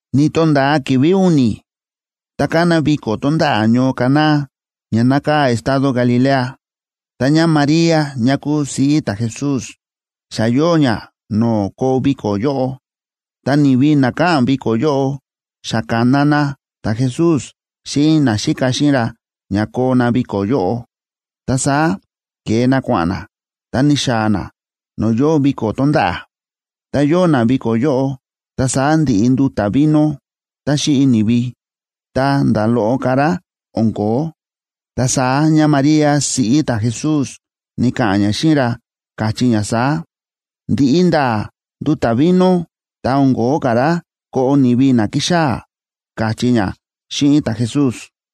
Ni̱to̱nda̱a ki̱vi̱ u̱ni̱, ta ka̱na viko̱ tonda̱ꞌa̱ ñoo Caná ña nákaa̱ estado Galilea. Ta ñáMaría ñá kúu siꞌí ta̱Jesús xa yóo ñá no̱o̱ koo viko̱ yóꞌo. Ta ni̱vi na káꞌa̱n viko̱ yóꞌo xa ka̱na na ta̱Jesús xíꞌin naxíka xíꞌin ra ña koo na viko̱ yóꞌo. Ta saá ke̱e na kua̱ꞌa̱n na, ta ni̱xaa̱ na no̱o̱ yóo viko̱ tonda̱ꞌa̱. Tá yóo na viko̱ yóꞌo, ta saá ndi̱ꞌi nduta̱ vino tá xíꞌi ni̱vi, ta nda̱ loꞌo ka̱ rá o̱n ko̱ó. Ta saá ñáMaría siꞌí ta̱Jesús ni̱ka̱ꞌa̱n ñá xíꞌin ra, káchí ñá saá: ―Ndi̱ꞌi nda̱a̱ nduta̱ vino, ta o̱n ko̱ó ka̱ rá koꞌo ni̱vi na ki̱xaa̱ ―káchí ñá xíꞌin ta̱Jesús.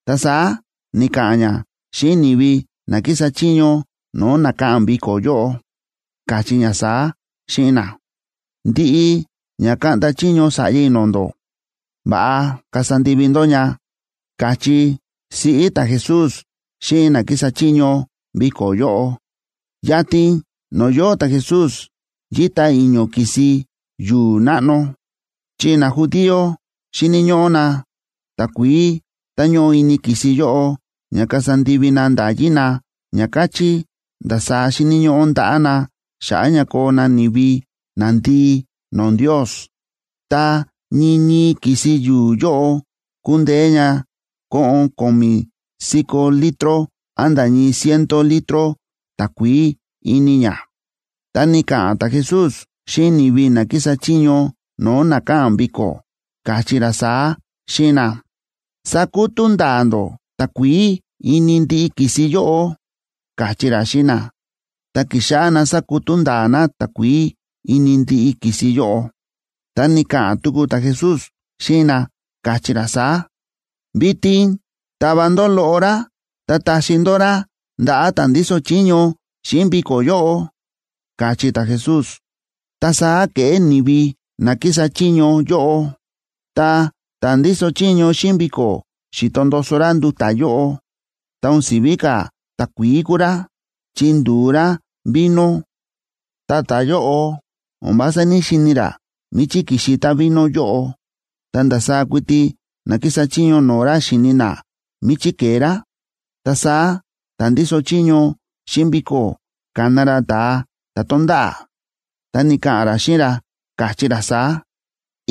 Ta saá ni̱ka̱ꞌa̱n ñá xíꞌin ni̱vi na kísa chiño no̱o̱ na káꞌa̱n viko̱ yóꞌo, káchí ñá saá xíꞌin na: ―Ndiꞌi ña kaꞌnda chiño sa̱ꞌya i̱ no̱o̱ ndó, va̱ꞌa kasa ndivi ndó ña ―káchí siꞌí ta̱Jesús xíꞌin na kísa chiño viko̱ yóꞌo. Yatin no̱o̱ yóo ta̱Jesús yíta i̱ño̱ ki̱si yu̱u̱ náꞌno, chi najudío xíni̱ ñóꞌó na takuií tá ñóꞌo ini ki̱si yóꞌo ña kasa ndivi na nda̱yí na, ña káchí ndasaá xíni̱ ñóꞌó ndaꞌá na xa̱ꞌa̱ ña koo na ni̱vi nandii no̱o̱ Ndios. Ta ñii ñii ki̱si yu̱u̱ yóꞌo kúndeé ña koꞌon ko̱mi̱ si̱ko̱ litro án nda̱ ñii ciento litro takuií ini ña. Ta ni̱ka̱ꞌa̱n ta̱Jesús xíꞌin ni̱vi na kísa chiño no̱o̱ na káꞌa̱n viko̱, káchí ra saá xíꞌin na: ―Sakutú nda̱a̱ ndó takuií ini ndiꞌi ki̱si yóꞌo ―káchí ra xíꞌin na. Ta ki̱xáꞌá na sákutú nda̱a̱ na takuií ini ndiꞌi ki̱si yóꞌo. Ta ni̱ka̱ꞌa̱n tuku ta̱Jesús xíꞌin na, káchí ra saá: ―Vitin tava ndó loꞌo rá ta taxi ndó rá ndaꞌa̱ ta̱ ndíso chiño xíꞌin viko̱ yóꞌo ―káchí ta̱Jesús. Ta saá ke̱ꞌé ni̱vi na kísa chiño yóꞌo. Tá ta̱ ndíso chiño xíꞌin viko̱ xi̱to ndoso ra nduta̱ yóꞌo, ta o̱n si̱ví ka̱ takuií kúu rá, chi ndu̱u rá vino. Ta ta̱yóꞌo o̱n vása ní‑xini̱ ra míchí ki̱xi távino yóꞌo, ta ndasaá kuiti na kísa chiño no̱o̱ ra xíni̱ na míchí ke̱e rá. Ta saá ta̱ ndíso chiño xíꞌin viko̱ ka̱na ra ta̱a ta̱ to̱nda̱ꞌa̱, ta ni̱ka̱ꞌa̱n ra xíꞌin ra, káchí ra saá: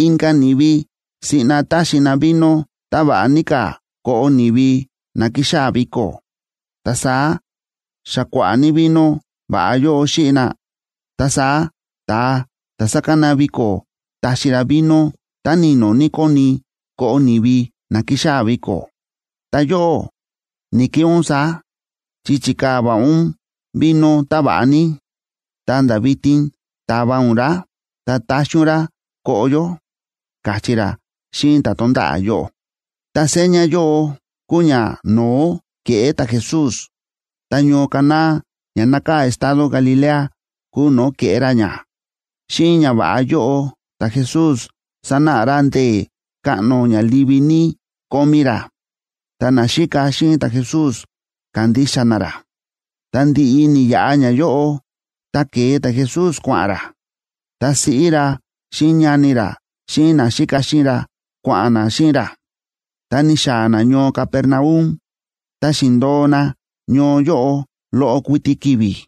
―Inka̱ ni̱vi siꞌna táxi na vino táva̱ꞌa ní ka̱ koꞌo ni̱vi na ki̱xaa̱ viko̱. Ta saá, xa kua̱ꞌa̱ ní vino va̱ꞌa yóꞌo xíꞌi na, ta saá ta̱a ta̱ sákana viko̱ táxi ra vino tá ni̱no̱ ní kóni koꞌo ni̱vi na ki̱xaa̱ viko̱. Ta yóꞌó, ni̱‑keꞌé ún saá, chi chi̱kaa̱ va̱ꞌa ún vino táva̱ꞌa ní, ta̱nda̱ vitin ta̱va ún rá ta ta̱xi ún rá koꞌo yó ―káchí ra xíꞌin ta̱ to̱nda̱ꞌa̱ yóꞌo. Ta seña yóꞌo kúu ñano̱ó ke̱ꞌé ta̱Jesús, ta ñoo Caná ña nákaa̱ estado Galilea kúu no̱o̱ ke̱ꞌé ra ña. Xíꞌin ñava̱ꞌa yóꞌo ta̱Jesús sa̱náꞌa ra ndee̱ káꞌno ña livi ní kómí ra. Ta naxíka xíꞌin ta̱Jesús ka̱ndixa na ra. Ta ndi̱ꞌi ni̱yaꞌa ñayóꞌo, ta ke̱e ta̱Jesús kua̱ꞌa̱n ra. Ta siꞌí ra, xíꞌin ñani ra, xíꞌin naxíka xíꞌin ra, kua̱ꞌa̱n na xíꞌin ra, ta ni̱xaa̱ na ñoo Capernaum, ta xi̱ndo̱o na ñoo yóꞌo loꞌo kuiti ki̱vi̱.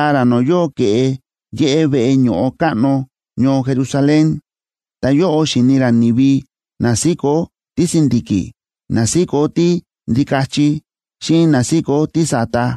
Ki̱xaa̱ ra no̱o̱ yóo ke̱ꞌe yéꞌé veꞌe ño̱ꞌo káꞌno ñoo Jerusalén, ta yóꞌo xi̱ni ra ni̱vi na síkó tísi̱ndi̱ki̱, na síkó tíndikachi, xíꞌin na síkó tísa̱ta.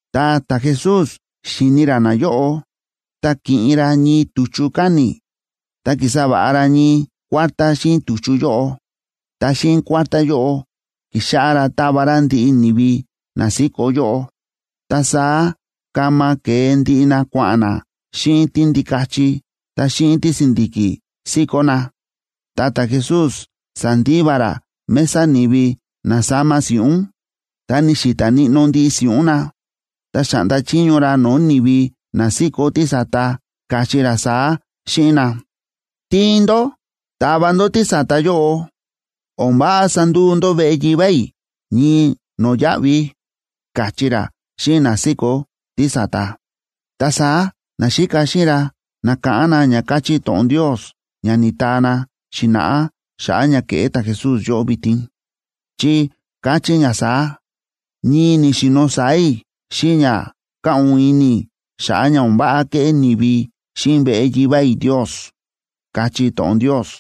Tá ta̱Jesús xi̱ni ra nayóꞌo, ta ki̱ꞌin ra ñii tu̱chu káni̱, ta ki̱sa va̱ꞌa ra ñii kuártá xíꞌin tu̱chu yóꞌo. Ta xíꞌin kuártá yóꞌo ki̱xáꞌá ra tava ra ndiꞌi ni̱vi na síkó yóꞌo, ta saá kama ke̱e ndiꞌi na kua̱ꞌa̱n na xíꞌin tíndikachi ta xíꞌin tísi̱ndi̱ki̱ síkó na. Ta ta̱Jesús sa̱ndiva ra mesa ni̱vi na sáma si̱ꞌún, ta ni̱xi̱ta̱ níꞌnó ndiꞌi si̱ꞌún na. Ta xa̱ꞌnda chiño ra no̱o̱ ni̱vi na síkó tísa̱ta, káchí ra saá xíꞌin na: ―¡Tiin ndó tava ndó tísa̱ta yóꞌo! O̱n váꞌa sanduu ndó veꞌe Yivá i̱ ñii no̱yáꞌvi ―káchí ra xíꞌin na síkó tísa̱ta. Ta saá naxíka xíꞌin ra na̱káꞌán na ña káchí to̱ꞌon Ndios ña ni̱taa na xi̱na̱ꞌá xa̱ꞌa̱ ña ke̱ꞌé ta̱Jesús yóꞌo vitin, chi káchí ña saá: “Ñii ni̱xi̱no̱ sáa̱ i̱ xíꞌin ña káꞌu̱n ini i̱ xa̱ꞌa̱ ña o̱n váꞌa kéꞌé ni̱vi xíꞌin veꞌe Yivá i̱ Ndios”, káchí to̱ꞌon Ndios.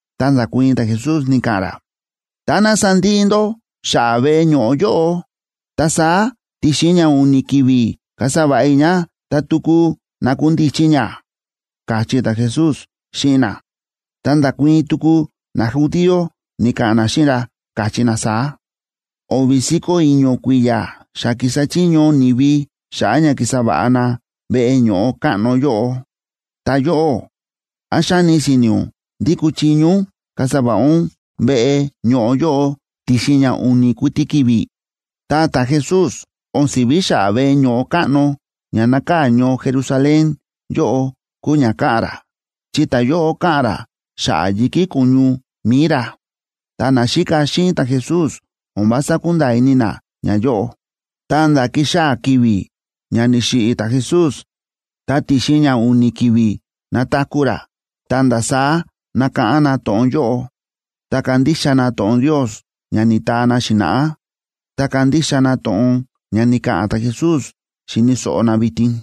Ta nda̱kuii̱n ta̱Jesús, ni̱ka̱ꞌa̱n ra: ―Táná sandiꞌi ndó xa̱ꞌa̱ veꞌe ño̱ꞌo yóꞌo, ta saá ti̱xin ña u̱ni̱ ki̱vi̱ kasa va̱ꞌa i̱ ña ta tuku nakundichi ña ―káchí ta̱Jesús xíꞌin na. Ta nda̱kuii̱n tuku najudío, ni̱ka̱ꞌa̱n na xíꞌin ra, káchí na saá: ―O̱vi̱ si̱ko̱ i̱ño̱ kui̱ya̱ xa ki̱sa chiño ni̱vi xa̱ꞌa̱ ña ki̱sa va̱ꞌa na veꞌe ño̱ꞌo káꞌno yóꞌo. Ta yóꞌó, ¿án xáni si̱ni̱ ún ndí kúchiño ún kasa va̱ꞌa ún veꞌe ño̱ꞌo yóꞌo ti̱xin ña u̱ni̱ kuiti ki̱vi̱? Ta ta̱Jesús o̱n si̱ví xa̱ꞌa̱ veꞌe ño̱ꞌo káꞌno ña nákaa̱ ñoo Jerusalén yóꞌo kúu ña káꞌa̱n ra, chi ta̱yóꞌo káꞌa̱n ra xa̱ꞌa̱ yi̱kí ko̱ñu mi̱i ra. Ta naxíka xíꞌin ta̱Jesús o̱n vása kúnda̱a̱ ini na ñayóꞌo, ta̱nda̱ ki̱xaa̱ ki̱vi̱ ña ni̱xiꞌi̱ ta̱Jesús ta ti̱xin ña u̱ni̱ ki̱vi̱ na̱taku̱ ra, ta̱nda̱ saá na̱káꞌán na to̱ꞌon yóꞌo, ta ka̱ndixa na to̱ꞌon Ndios ña ni̱taa na xi̱na̱ꞌá, ta ka̱ndixa na to̱ꞌon ña ni̱ka̱ꞌa̱n ta̱Jesús xi̱ni̱ so̱ꞌo na vitin.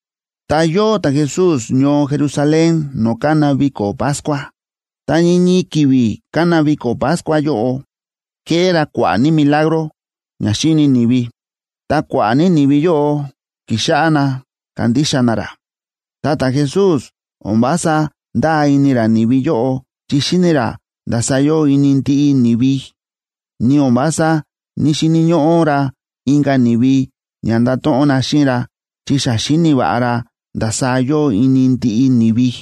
Ta yóo ta̱Jesús ñoo Jerusalén no̱o̱ kána viko̱ Pascua, ta ñii ñii ki̱vi̱ kána viko̱ Pascua yóꞌo, ke̱ꞌé ra kua̱ꞌa̱ ní milagro ña xi̱ni ni̱vi, ta kua̱ꞌa̱ ní ni̱vi yóꞌo ki̱xáꞌá na kándixa na ra. Ta ta̱Jesús o̱n vása ndáa ini ra ni̱vi yóꞌo chi xíni̱ ra ndasaá yóo ini ndiꞌi ni̱vi. Ni o̱n vása ní‑xini̱ ñóꞌó ra inka̱ ni̱vi ña ndato̱ꞌon na xíꞌin ra, chi xa xíni̱ va̱ꞌa ra ndasaá yóo ini ndiꞌi ni̱vi.